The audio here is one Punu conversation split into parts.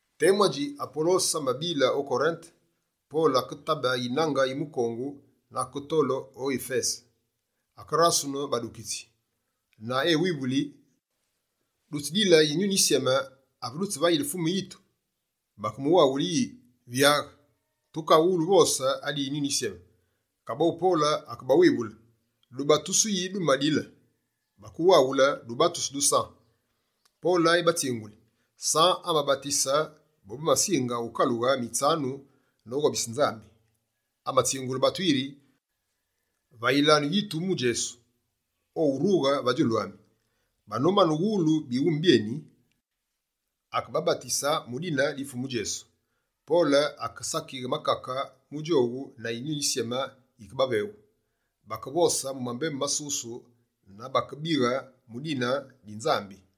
Temu adji Apolose abile o Korinte, Pole aketabe yinange yi mukongu na aketole o Yifese. Akerasunu badukitsi na ewivuli: «Dutsidile Yinyuni Yisyeme, ave dutsivayile Fumu yitu?» Bakemuwaghule yi: «Vyaghe! Tukawulu uvose adi Yinyuni Yisyeme.» Kaboghu Pole akebawivule: «Dubatusu yi dumadile?» Bakewaghule: «Dubatusu du San.» Pole ebatsinguli: «San amabatise bobamasinge wukalughe mitsanu noghobise Nzambi. Amatsingule batu yiri: “Vayilanu yitu mu Djesu, owurughe va djulu ami.”» Banomane uwulu bighume byeni, akebabatusu mu dine di Fumu Djesu. Pole akesakighe makake mu djowu na Yinyuni Yisyeme yike baveghu. Bakevose mu mambembu masusu na bakebighe mu dikabu di Nzambi.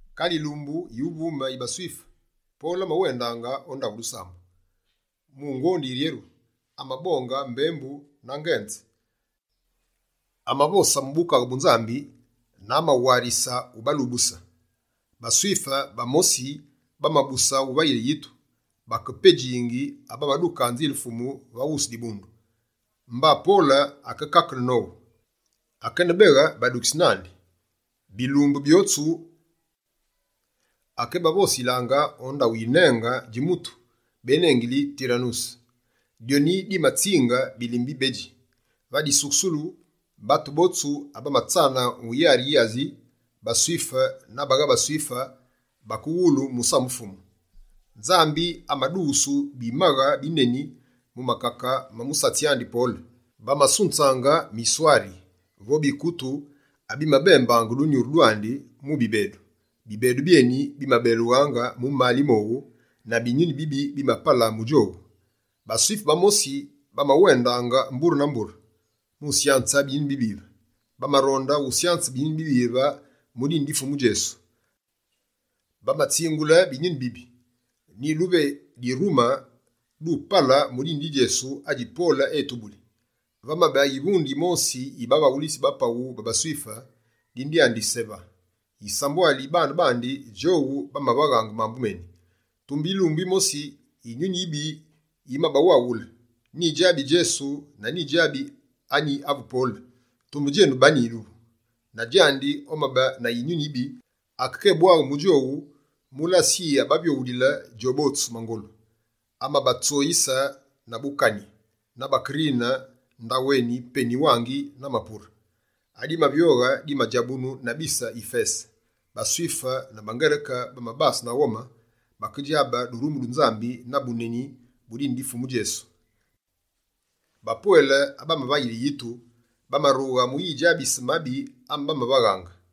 Kale yilumbu yuvume yi baSwife, Pole amawendaange o ndaghu dusambu. Mu ngondi yiryeru, amabonge mbembu na ngenze. Amavose mu Bukaghe bu Nzambi na amawarise ubawulusu. BaSwife bamosi bamabuse uvayile yitu, bakepedji abamaduke Nzile Fumu va wusu dibundu. Mba Pole akekakene nowu, akenebeghe badukitsi nandi. Bilumbu byotsu akebavosilaange o ndaghu yinenge dji mutu, benengili Tiranuse. Dyoni dimatsinge bilime bibedji. Va disukusulu, batu botsu abamatsana mu yari yi Asi, baSwife na bagha baSwife, bakeghulu musamu Fumu. Nzambi amadughusu bimaghe bineni mu makake ma musatsi andi Pole. Bamasunzaange miswari vo bikutu abimabembaange dunyuru dwandi mu bibedu. Bibedu byeni bimabelughaange mu mali mowu na binyuni bibi bimapala mu djowu. BaSwife bamosi, bamawendaange mbure na mbure mu syanze binyuni bibive. Bamaronde usyanze binyuni bibive mu dine di Fumu Djesu. Bamatsingula binyuni bibi: «Nyiduve dirume, dupale mu dine di Djesu adji Pole etubuli!» Vamabe yivunde yimosi yi bavaghulitsi ba paghu ba baSwife, dine dyandi Seva. Yisambwali yi bane bandi, djowu bamavaghe mambu meni. Tumbe yilumbu yimosi yinyuni yibi yimabawaghule: «Nyidjabi Djesu na nyidjabi anyi avu Pole. Tumbe djenu, bani duvu?» Na djandi omabe na yinyuni yibi, akekébwaghe mu djowu mu lase yi abavyoghulile djobotsu mangolu. Amabatsoyise na bukani, na bakerine ndaghu eni, peni-wangi na mapure. Adimavyoghe dimadjabunu na bise Yifese. BaSwife na baNgereke bamabase na ghome, bakedjabe durumu du Nzambi na buneni bu dine di Fumu Djesu. Bapwele abamavayile yitu, bamarunga mu yidjabise mabi ame bamavaghaange.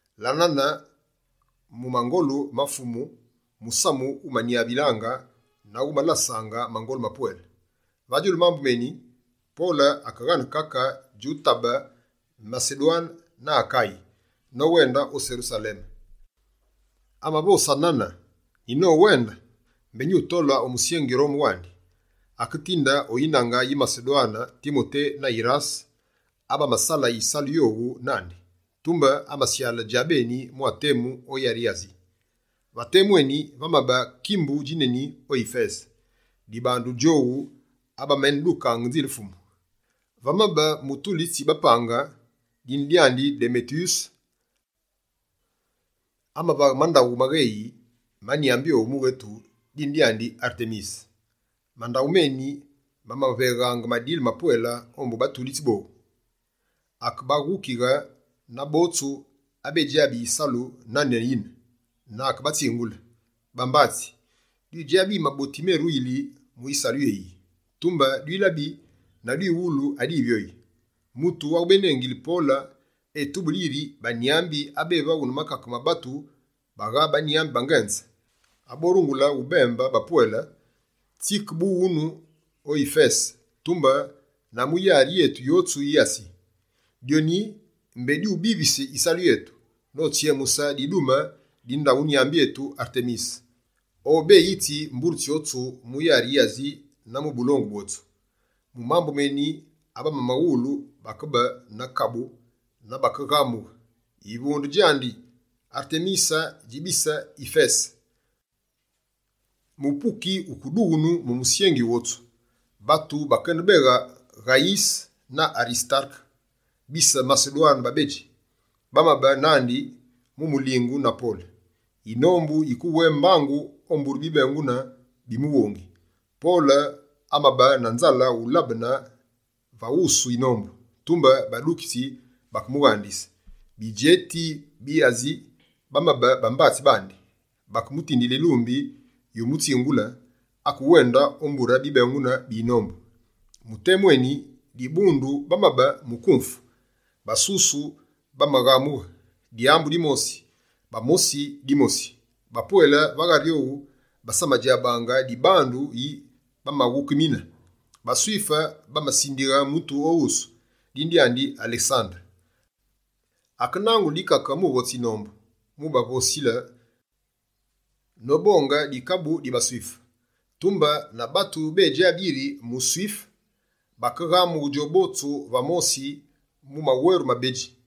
La nane mu mangolu ma Fumu, musamu wumanyavaange na wumalasaange mangolu mapwele. Va djulu mambu meni, Pole akeghane kake djutabe Masedwane na Akaye, nowende o Serusaleme. Amavose nane: «Nyinowende, mbé nyutole o musyengi Rome wandi.» Aketinde o yinange yi Masedwane Timote na Yirase, abamasala yisalu yowu nandi. Tumbe amasyale djabeni mwa temu o yari yi Asi. Va temu eni, vamabe kimbu djineni o Yifese, dibandu djowu abameneduka Nzile Fumu. Vamabe mutulitsi bapange, dine dyane Demeteyuse, amavaghe mandaghu magheyi ma nyambi owu mughetu, dine dyandi Artemise. Mandaghu meni mamavegha madile mapwele ombu batulitsi botsu. Akebaghukighe, na botsu abedjabi yisalu nane yine, na akebatsingule: «Bambatsi, dwidjabi yi maboti meruyili mu yisalu yéyiyi. Tumbe dwilabi na dwiwulu adivyoyi: mutu awu bénengili Pole etubuli yiri, banyambi abevaghu na makake ma batu, bagha banyambi bangenze! Aborungule ubembe bapwele tsike bu ghunu o Yifese, tumbe na mu yari yetu yotsu yi Asi. Dyoni mbé dyubivise yisalu yetu, notsyemuse didume di ndaghu nyambi etu Artemise, obeyitsi mbure tsyotsu mu yari yi Asi na mu bulongu bwotsu.» Mu mambu meni, abamawulu bakebase na kabu na bakeghamughe: «Yivunde djandi, Artemise dji bise Yifese!» Mupuki wukedughunu mu musyengi wotsu. Batu bakenebeghe Ghayise na Arisitareke, bise Masedwane babedji, bamabe nandi mu mulingu na Pole. Yinombu yikewé mbangu o mbure bibengunu bi mighungi. Pole amabe na nzale ulabene va wusu yinombu, tumbe badukitsi bakemughandise. Bidjeti bi Asi bamabe bambatsi bandi, bakemutindile yilumbi yumutsingule, akéwende o mbure bibengunu bi yinombu. Mu temu eni, dibundu bamabe mu nkumfu. Basusu bamaghamugha dyambu dimosi, bamosi dimosi. Bapwele va ghari owu basamadjabaange dibandu yi bamaghukimine. BaSwife bamasindighe mutu o wusu, dine dyandi Alesandere. Akenangule dikake mu votse yinombu, mubavosile nobonge dikabu di baSwife. Tumbe na batu bédjabi yiri muSwife, bakeghamughe djobotsu va mosi mu maweru mabedji: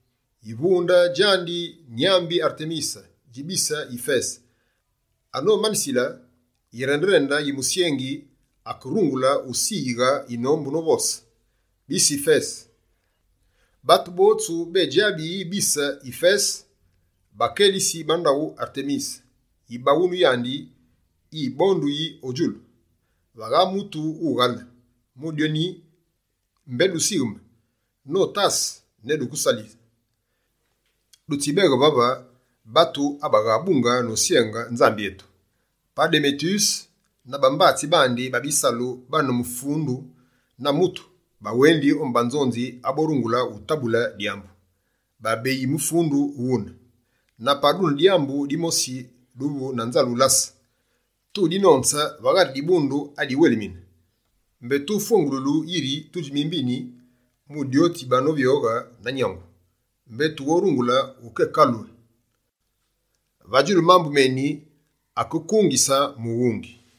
«Yivunde djandi nyambi Artemise dji bise Yifese!» Anomanisile, yirende-rende yi musyengi akerungule usiyighe yinombu novose: «Bise Yifese, batu botsu bédjabi yi bise Yifese bakelitsi ba ndaghu Artemise, yibaghunu yandi yibonduyi o djulu. Vagha mutu wughale. Mu dyoni, mbé dusigheme notase ne duke salise. Dutsibeghe vave batu abaghabunge nosyenge Nzambi etu. Pa Demeteyuse na bambatsi bandi ba bisalu bane mufundu na mutu, bawendi ombu banzonzi aborungule utabule dyambu. Babeyi mufundu ghune. Na pa dune dyambu dimosi duvu na nzale ulase, tudinonze va ghari dibundu adiwelmine. Mbé tufwengululu yiri tudji mimbini, mu dyo ditsivyoghe na nyangu, mbé tughorungule ukekaghule. Va djulu mambu meni, akekungise mughungi.»